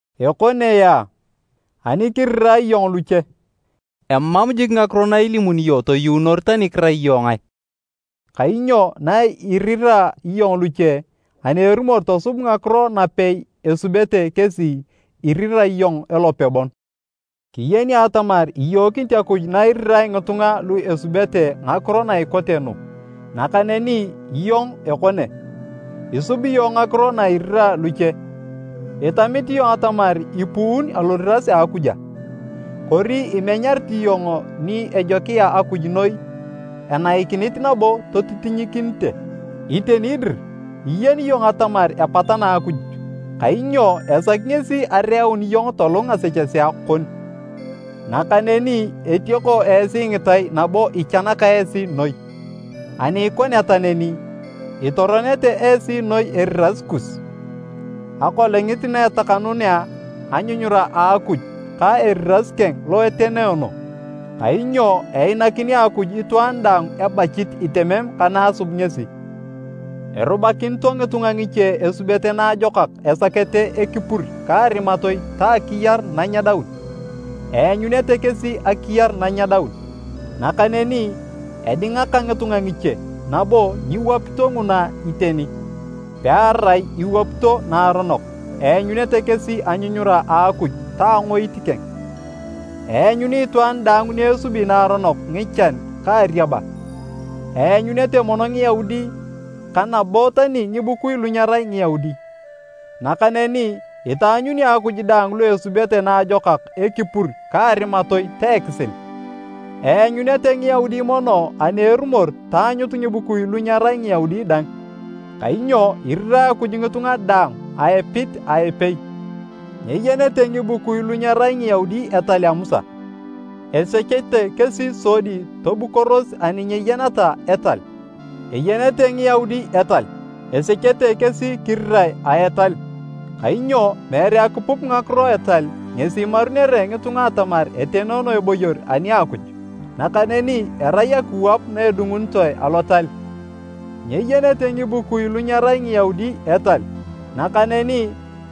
Ekone yaa, ani kirirae iyong luche, emam jik ngakiro na ilimuni iyong toyuunor tani kirai iyong ngae, kainyo na irira iyong luche ani erumor tosub ngakiro napei esubete kesi, irira iyong elope bon. Kiyeni atamar iyookinit Akuj na irira ngitunga lu esubete ngakiro na ikote nu. Nakaneni iyong ekone, isubi iyong ngakiro na irira luche! Itamit iyong atamar ipuun aloriras a Akuj a? Kori imenyarit iyong ni ejokia Akuj noi enaikinit nabo totitinyikinite. Iteni dir iyeni iyong atamar epatana Akuj, kainyo esaki ngesi areeun iyong tolung ngasechesea kon. Nakaneni etioko esi ngitai nabo ichanaka esi noi. Ani ikoneta neni, itoronete esi noi eriras kus Akolongit na etakanuunea anyunyura a Akuj ka eriras keng lo etenoono. Kainyo einakini Akuj itwaan daang ebachit itemem ka na asub ngesi. Erubakinito ngitunga ngiche esubete naajokak esakete ekipur ka arimatoi ta akiyar nanyedaun, eanyunete kesi akiyar nanyedaun. Nakaneni edingaka ngitunga ngiche nabo nyiwapito nguna iteni, pearai iwapito naaronok, eanyunete kesi anyunyura a Akuj ta angoit keng. Eanyuni itwaan daang ni esubi naaronok ngichan ka ariaba, eanyunete mono Ngiyaudi ka nabo tani ngibukui lu nyerai Ngiyaudi. Nakaneni itaanyuni Akuj daang lu esubete naajokak ekipur ka arimatoi ta ekisil. Eanyunete Ngiyaudi mono ani erumor taanyut ngibukui lu nyerai Ngiyaudi dang. Kainyo irirae Akuj ngitunga daang a epit a epei. Nyeyenete ngibukui lu nyerai Ngiyaudi etal a Musa. Esechete kesi sodi tobukoros ani nyeyeneta etal. Eyenete Ngiyaudi etal, esechete kesi kirirae a etal. Kainyo meere akipup ngakiro a etal ngesi imarunere ngitunga atamar etenoono eboyor ani a Akuj, nakaneni erai akiwap na edungunitoe Alotal. Nyeyenete ngikubui lu nyerai Ngiyaudi etal, nakaneni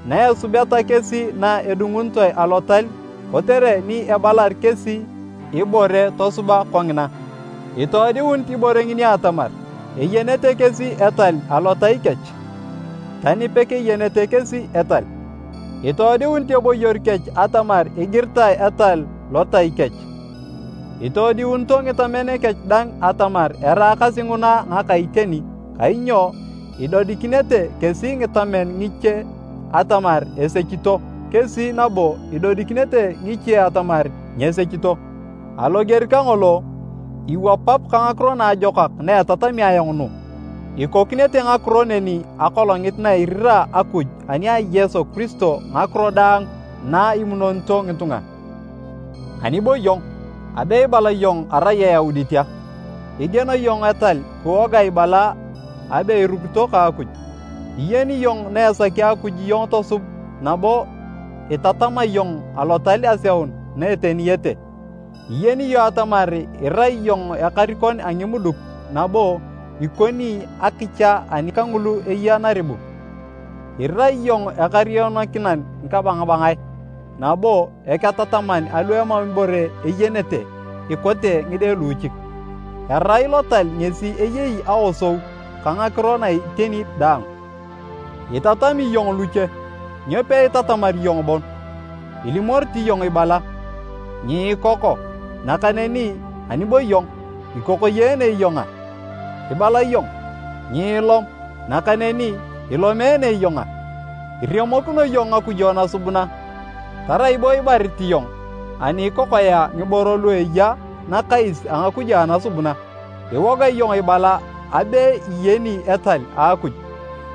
na esubeta kesi na edungunitoe alotal kotere ni ebalar kesi ibore tosuba kongina, itoodiunit ibore ngini atamar, eyenete kesi etal alotai kech, tani pekeyenete kesi etal. Itoodiunit eboyor kech atamar igiritae etal lotai kech. Itoodiunito ngitamen kech dang atamar eraakasi nguna ngaka iteni kainyo idodikinete kesi ngitamen ngiche atamar esechito kesi nabo idodikinete ngiche atamar nyesechito. Aloger kangolo, iwapap ka Ngakiro Naajokak na etatami ayong nu, ikokinete ngakiro neni Akolongit na irira Akuj ani a Yesu Kiristo ngakiro daang na imunonito ngitunga. Ani bo iyong? Abe ibala iyong arai Eyaudit a? Igieno iyong etal kiwoga ibala abe irukito ka Akuj, iyeni iyong na esaki Akuj iyong tosub nabo itatama iyong Alotal aseun na eteniyete, iyeni iyong atamar irai iyong ekarikon a ngimuduk nabo ikoni akicha ani kangulu eya naribu. Irai iyong ekarionokinan ngikabangabangae nabo eketataman alu emam ibore eyenete ikote ngide luuchik. Erai Lotal ngesi eyei aosou ka ngakiro na iteni daang. Itatami iyong luche, nyo peitatamar iyong bon? Ilimorit iyong ibala, “Nyiikoko”, nakaneni anibo iyong, ikokoyeene iyong a? Ibala iyong, “Nyiilom”, nakaneni ilomeene iyong a? Iremokino iyong ngakujo nasubuna, tarai bo ibarit iyong ani ikokoea ngiboro lu eya nakais a ngakujo anasubuna. Iwoga iyong ibala abe iyeni etal a Akuj,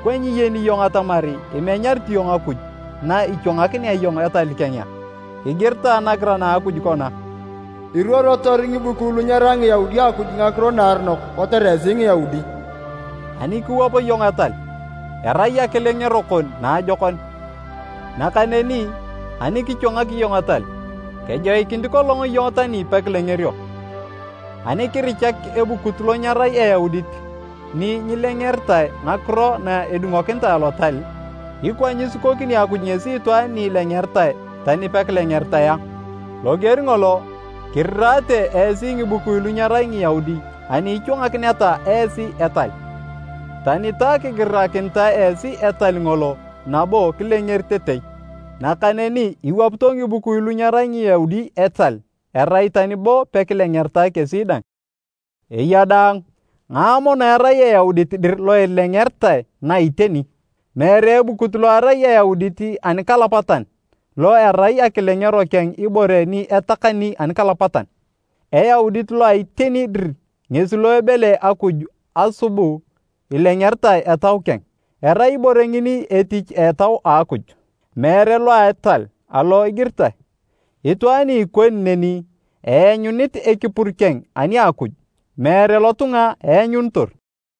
ikwa nyiyeni iyong atamar imenyarit iyong Akuj na ichwangakinea iyong etal keng a? Igiritae nagiran a Akuj kona, “Iruorotor ngibukui lu nyerai Ngiyaudi Akuj ngakiro naaronok kotere esi Ngiyaudi.” Ani kiwap iyong etal, erai akilengero kon naajokon. Nakaneni ani kichwangak iyong etal, kejoikinit kolong iyong tani pekilengerio. Ani kirichak ebukut lo nyerai Eyaudit ni nyilengeritae ngakiro na edungokinitae Alotal, ikwa nyisikokini Akuj ngesi itwaan ni ilengeritae tani pekilengeritae a? Loger ngolo, kirirate esi ngibukui lu nyerai Ngiyaudi ani ichwanganakineta esi etal. Tani ta kigirakinitae esi etal ngolo nabo kilengeritetei. Nakaneni iwapito ngibukui lu nyerai Ngiyaudi etal erai tani bo pekilengeritae kesi dang. Eya daang, ngae mono erai Eyaudit dir lo ilengeritae na iteni? Meere ebukut lo erai Eyaudit anikalapatan, lo erai akilengero keng ibore ni etakani anikalapatan. Eyaudit lo a iteni dir ngesi lo ebele Akuj asubu ilengeritae etau keng. Erai ibore ngini etich a Etau a Akuj, meere lo a etal alo igiritae. Itwaan ni ikoni neni, eanyunit ekipur keng ani a Akuj, meere lotunga eanyunitor.